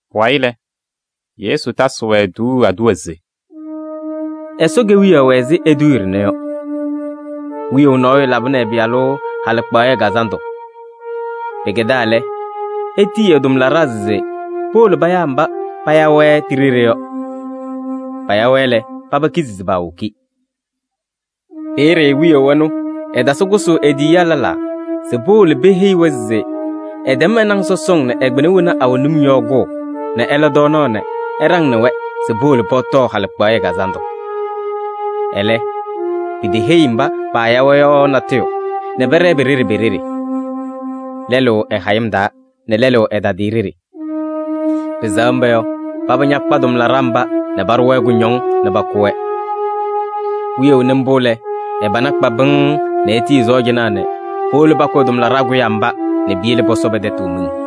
Pʋwayɩ lɛ, Yesu tasɩ-wɛ tuuu aduwa se: “Ɛsɔ Kewiyaɣ wɛ ɛzɩ eduuye ɖɩnɛ yɔ: wiyaʋ nɔɔyʋ labɩnɩ ɛ-pɩyalʋ halɩkpaɣyɛ kazandʋ. Pɩkɛdaa lɛ, etiyi ɛ-tʋmlaɖaa se powolo payaa mba paaya-wɛ ti-ɖeɖe yɔ. Paya-wɛ lɛ, paba kizi se paawoki. Peeye wiyaʋ ɛnʋ ɛtasɩ kʋsʋʋ e-tiyiyaa lɛlaa se powolo peheyi-wɛ se ɛtɛm ɛ-naŋ sɔsɔŋ nɛ ɛ-kpɩna wena awɛ num yɔ kʋʋ nɛ ɛla tɔɔnaɣ nɛ ɛɖaŋnɩ-wɛ se powolo pɔtɔɔ halɩkpaɣyɛ kazandʋ! Ɛlɛ, piteheyi mba paaya-wɛ yɔ natʋyʋ nɛ pɛɖɛɛ pe-ɖeɖe pe-ɖeɖe: lɛlʋ ɛ-hayɩm taa nɛ lɛlʋ ɛ-tadɩyɛ ɖeɖe. Pɩsɛɣ mba yɔ, paba ñakpa tʋmlaɖaa mba nɛ paɖʋ-wɛ kʋñɔŋ nɛ pakʋ-wɛ. Wiyaʋ nɩ mbʋ lɛ, ɛ-pana kpa pɩŋŋ nɛ etiyi ɛ-sɔɔjanaa nɛ powolo pakʋ ɛ-tʋmlaɖaa kʋyaa mba nɛ piyele pɔsɔ pɛ-tɛtʋ miŋ.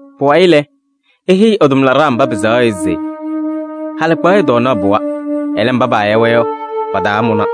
“Pʋwayɩ lɛ, eheyi ɛ-tʋmlaɖaa mba pɩsɛɣa yɔ se: ‘Halɩkpaɣyɛ tɔɔnaɣ pɩwa, ɛlɛ, mba paaya-wɛ yɔ, pataamʋna.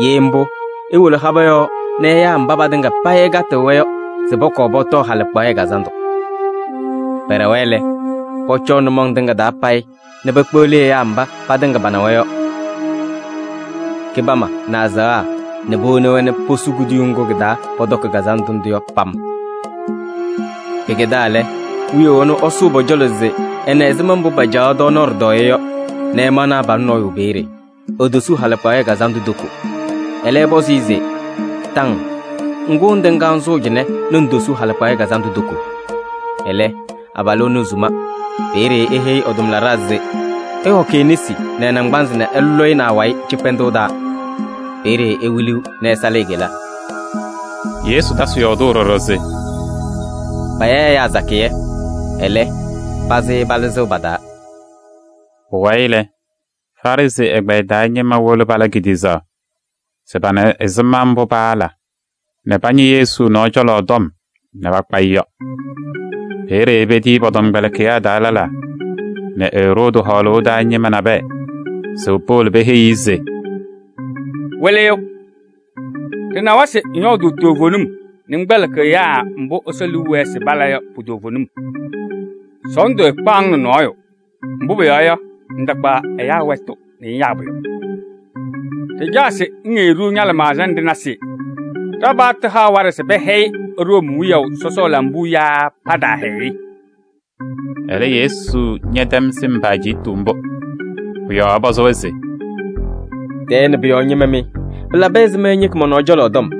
Ye mbʋ, iwolo habɛɛ yɔɔ nɛ ɩyaa mba patɩŋa payɩ ɩkatɩɣ-wɛ yɔ se pɔkɔɔ pɔtɔɔ halɩkpaɣyɛ kazandʋ.’ Pɛɖɛwa lɛ, pɔcɔɔ nʋmɔŋ tɩŋa taa payɩ nɛ pekpeɣli ɛyaa mba patɩŋa panawa yɔ: kɩbama nɛ azaɣa nɛ powoni-wɛ nɛ posu kuduyuu ŋgʋ kɩ-taa pɔtɔkɩ kazandʋ ndʋ yɔ pam. “Pɩkɛdaa lɛ, wiyaʋ ɛnʋ ɛsʋ pɔ-cɔlɔ se ɛna ɛzɩma mbʋ pacaɣ tɔɔnaɣ ɖɩtɔɔyɛ yɔ nɛ ɛmaɣnɩ abalʋ nɔɔyʋ peeye, etosuu halɩkpaɣyɛ kazandʋ toko. Ɛlɛ ɛpɔzɩ-ɩ se: ‘Taŋ! Ŋgʋ ŋtɩŋaa ŋsʋʋ cɩnɛ nɛ ŋtosuu halɩkpaɣyɛ kazandʋ toko?’ Ɛlɛ, abalʋ ɛnʋ esuma. Peeye eheyi ɛ-tʋmlaɖaa se: ‘Ɩhɔkɩ e-nesi nɛ ɛ-naŋgbanzɩ nɛ ɩlɔ-ɩ nɛ awayɩ cɩkpɛndʋʋ taa. Peeye ewiliɣ nɛ ɛsalɩ e-kela.’” Yesu tasɩ yɔɔdʋʋ ɖɔɖɔ se: “Paya ɛyaa sakɩyɛ, ɛlɛ, pazɩ palɩzɩɣ pa-taa.” Pʋwayɩ lɛ, Farɩsɩ ɛgbɛyɛ taa ñɩma wolo pala kediɣzaɣ se pana ɛzɩma mbʋ paala nɛ pañɩ Yesu nɔɔ cɔlɔ tɔm nɛ pakpa-ɩ yɔ. Peeye petiyi pɔ-tɔmkpɛlɩkɩyaa taa lɛlaa nɛ Eroodi hɔɔlʋʋ taa ñɩma nabɛyɛ se powolo peheyi-i se: “Wɩlɩyʋ! Ɖɩnawa se ŋyɔɔdʋʋ toovenim nɛ ŋkpɛlɩkɩɣ ɛyaa mbʋ Ɛsɔ liu wɛɛ se pala yɔ pu-toovenim. Sɔɔndʋ ɛɛkpaɣ-ŋ nɛ nɔɔyʋ, mbʋ pʋyɔɔ yɔ, ŋtakpaɣ ɛyaa wɛtʋ nɛ ŋyaa pʋyʋ. Ɖɩcaɣ se ŋheyi-ɖʋ ña-lɩmaɣza nɛ ɖɩna se: ɖa-paɣtʋ haɣ waɖɛ se pɛhɛyɩ Room wiyaʋ sɔsɔ lambuu yaa pataahɛyɩ-ɩ?” Ɛlɛ, Yesu ñɛtɛm sɩm pa-ajiitu mbʋ. Pʋ-yɔɔ ɛpɔzɩ-wɛ se: “Tɛɛ nɛ pʋ-yɔɔ ñɩma mɩ! Pɩlabɩ ɛzɩma ɩñɩkɩ mɔ-nɔɔ cɔlɔ tɔm?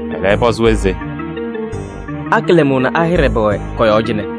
Ɛlɛ ɛpɔzɩ-wɛ se: “A-kɩlɛmʋʋ nɛ a-hɩɖɛ pɛwɛ kɔ-yɔɔ cɩnɛ?”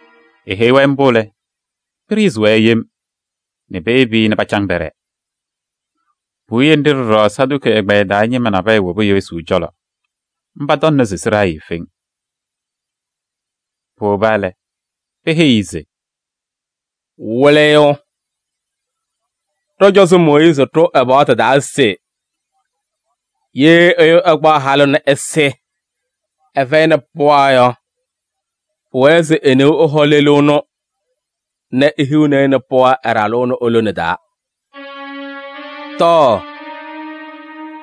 Eheyi-wɛ mbʋ lɛ, pɩɖɩɣzɩ-wɛ yem nɛ peyebi-i nɛ pacaŋ pɛɖɛɛ. Puwiye nɖɩ ɖɔɖɔ Saduki ɛgbɛyɛ taa ñɩma wobi Yesu cɔlɔ, mba tɔŋna se sɩɖaa eefeŋ. Powoba lɛ, peheyi-i se: “Wɩlɩyʋ! Ɖɔ-cɔzɔ Mooyiizi ɖʋ ɛ-paɣtʋ taa se: ‘Ye ɛyʋ ɛkpaɣ halʋ nɛ ɛsɩ, ɛfɛyɩnɩ pɩɣa yɔ, pʋwɛɛ se e-neu ɛhɔ lelu ɛnʋ nɛ ehiɣni-i pɩɣa ɛ-ɖalʋ ɛnʋ e-lone taa.’ Tɔɔ!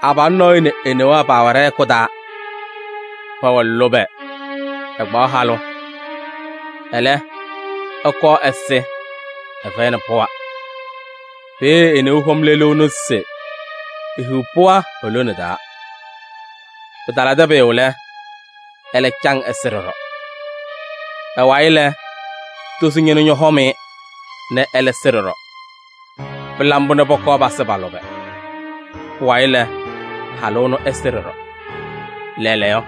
Abalʋ nɔɔyʋ nɛ e-newaa paawɛ ɖɛ-hɛkʋ taa, pɛwɛ lʋbɛ, ɛkpaɣ halʋ. Ɛlɛ, ɛkɔɔ ɛsɩ, ɛfɛyɩnɩ pɩɣa. Peeye e-neu hɔm lelu ɛnʋ se ehiɣ pɩɣa e-lone taa. Pɩtalabɩdɩ pʋyʋ lɛ, ɛlɛ caŋ ɛsɩ ɖɔɖɔ. Ɛlɛ wayɩ lɛ, tozo tʋ ñɔhɔm-ɩ nɛ ɛlɛ sɩ ɖɔɖɔ. Pɩla mbʋ nɛ pɔkɔɔ pasɩ pa-lʋbɛ. Pʋwayɩ lɛ, halʋ ɛnʋ ɛsɩ ɖɔɖɔ. Lɛɛlɛɛyɔ,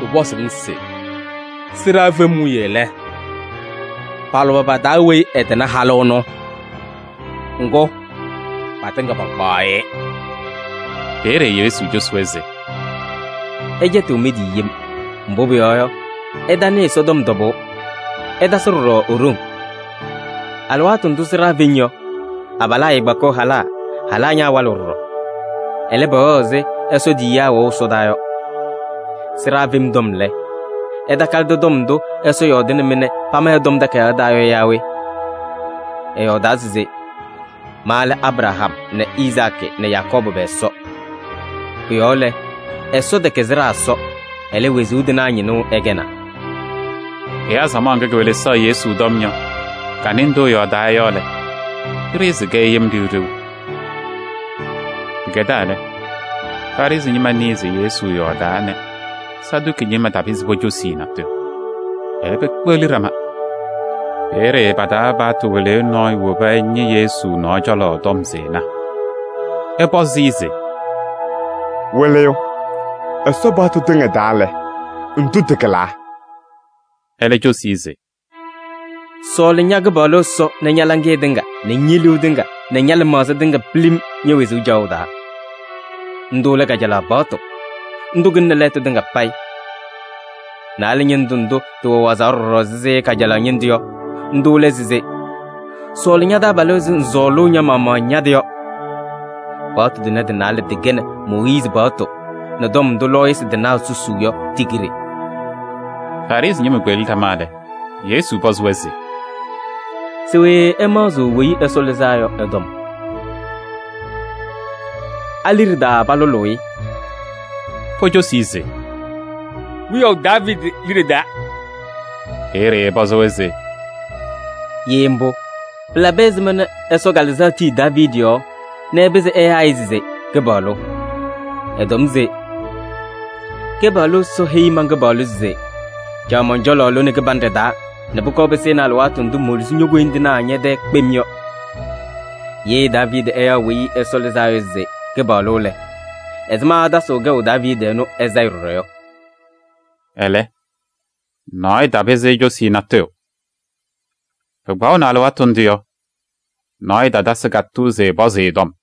ɖɩpɔzʋʋ-ŋ se: sɩɖaa fem wiye lɛ, pa-lʋbɛ pa-taa weyi ɛtɩnɩ halʋ ɛnʋ? Ŋgʋ, patɩŋa pakpaɣ-ɩ.” Peeye Yesu cosi-wɛ se: “Ɩcɛtɩɣ mɩ-tɩ yem, mbʋ pʋyɔɔ yɔ, ɩtanɩɩ Ɛsɔtɔm tɔbʋʋ, ɩtasɩ ɖɔɖɔ e-ɖoŋ. Alɩwaatʋ ndʋʋ sɩɖaa feŋ yɔ, abalaa ɛɛkpakɩɣ halaa, halaa ñaawalɩɣ ɖɔɖɔ. Ɛlɛ, pɛwɛɣ ɛzɩ Ɛsɔ tiyiyaa wɛʋ ɛsɔdaa yɔ. Sɩɖaa fem tɔm lɛ, ɩtakalɩdɩ tɔm ndʋ Ɛsɔ yɔɔdɩnɩ-mɩ nɛ pama ɛ-Tɔm Takayaɣ taa yɔ yaa we? Ɛyɔɔdaa se: ‘Ma lɛ Abraham nɛ Izaakɩ nɛ Yakɔɔbʋ pɛ-Ɛsɔ.’ Pʋ-yɔɔ lɛ, Ɛsɔ tɛkɛ sɩɖaa Ɛsɔ, ɛlɛ, wezuu tɩnaa ñɩnʋ ɛkɛnaa.” Ɛyaa samaɣ ŋga kewelesaɣ Yesu tɔm yɔ, kanɩ ndʋ ɛyɔɔdaa yɔ lɛ, pɩɖɩɣzɩ-kɛ yem ɖɩɣ ɖɩɣ. Pɩkɛdaa lɛ, Farɩsɩ ñɩma nɩɩ se Yesu yɔɔdaa nɛ Saduki ñɩma tapɩzɩ pocosi-i natʋyʋ, ɛlɛ pekpeɣli ɖama. Peeye pa-taa paɣtʋ wɩlɩyʋ nɔɔyʋ woba ɛñɩ Yesu nɔɔ cɔlɔ tɔm se ɛna, ɛpɔzɩ-ɩ se: “Wɩlɩyʋ! Ɛsɔ paɣtʋ tɩŋa taa lɛ, ndʋ tɩkɩlaa?” Ɛlɛ cosi-i se: “ ‘Sɔɔlɩ ña-Kɩpaɣlʋ Ɛsɔ nɛ ña-laŋɩyɛ tɩŋa nɛ ñe-liu tɩŋa nɛ ña-lɩmaɣza tɩŋa pilim ñe-wezuu caɣʋ taa.’ Ndʋ lɛ kajalaɣ paɣtʋ, ndʋ kɩlɩnɩ lɛɛtʋ tɩŋa payɩ. Naalɛ ñɩndʋ ndʋ tɩwɛ wazaɣ ɖɔɖɔ ɛzɩ kajalaɣ ñɩndʋ yɔ, ndʋ lɛ se: ‘Sɔɔlɩ ña-taabalʋ ɛzɩ ŋsɔɔlʋʋ ña-maɣmaɣ ña-tɩ yɔ.’ Paɣtʋ tʋnɛ tɩ-naalɛ tɩkɛnɩ Mooyiizi paɣtʋ nɛ tɔm ndʋ lɔɔyɩsɩ tɩnaa susuu yɔ ti-kiɖe.” Farɩsɩ ñɩma kpeɣli ɖama lɛ, Yesu pɔzɩ-wɛ se: “Se we ɩmaɣzɩɣ Weyi Ɛsɔ Lɩzaa Yɔ ɛ-tɔm? A-liɖe taa palʋlʋʋ-ɩ?” Pocosi-i se: “Wiyaʋ Daaviidi liɖe taa.” Peeye ɛpɔzɩ-wɛ se: “Ye mbʋ, pɩlabɩ ɛzɩma nɛ Ɛsɔ Kalɩzaɣ tii Daaviidi yɔɔ nɛ ɛpɩzɩ ɛyaa-ɩ se: ‘Kɩpaɣlʋ?’ Ɛtɔm se: ‘Kɩpaɣlʋ Ɛsɔ heyi man-Kɩpaɣlʋ se: caɣ mɔn-cɔlɔ lone kɩbanɖɛ taa nɛ pʋkɔɔ pɩsɩnɩ alɩwaatʋ ndʋ moluzi ño-koyindinaa ñɛ-tɛɛ kpem yɔ.’ Ye Daaviidi ɛyaɣ Weyi Ɛsɔ Lɩzaa Yɔ se: ‘Kɩpaɣlʋ’ lɛ, ɛzɩma ɛtasɩɣ kɛʋ Daaviidi ɛnʋ ɛ-sayɩ ɖɔɖɔ yɔ?” Ɛlɛ, nɔɔyʋ tapɩzɩ ecosi-i natʋyʋ. Pɩkpaɣʋnɩ alɩwaatʋ ndʋ yɔ, nɔɔyʋ tatasɩ katʋʋ se ɛpɔzɩ-ɩ tɔm.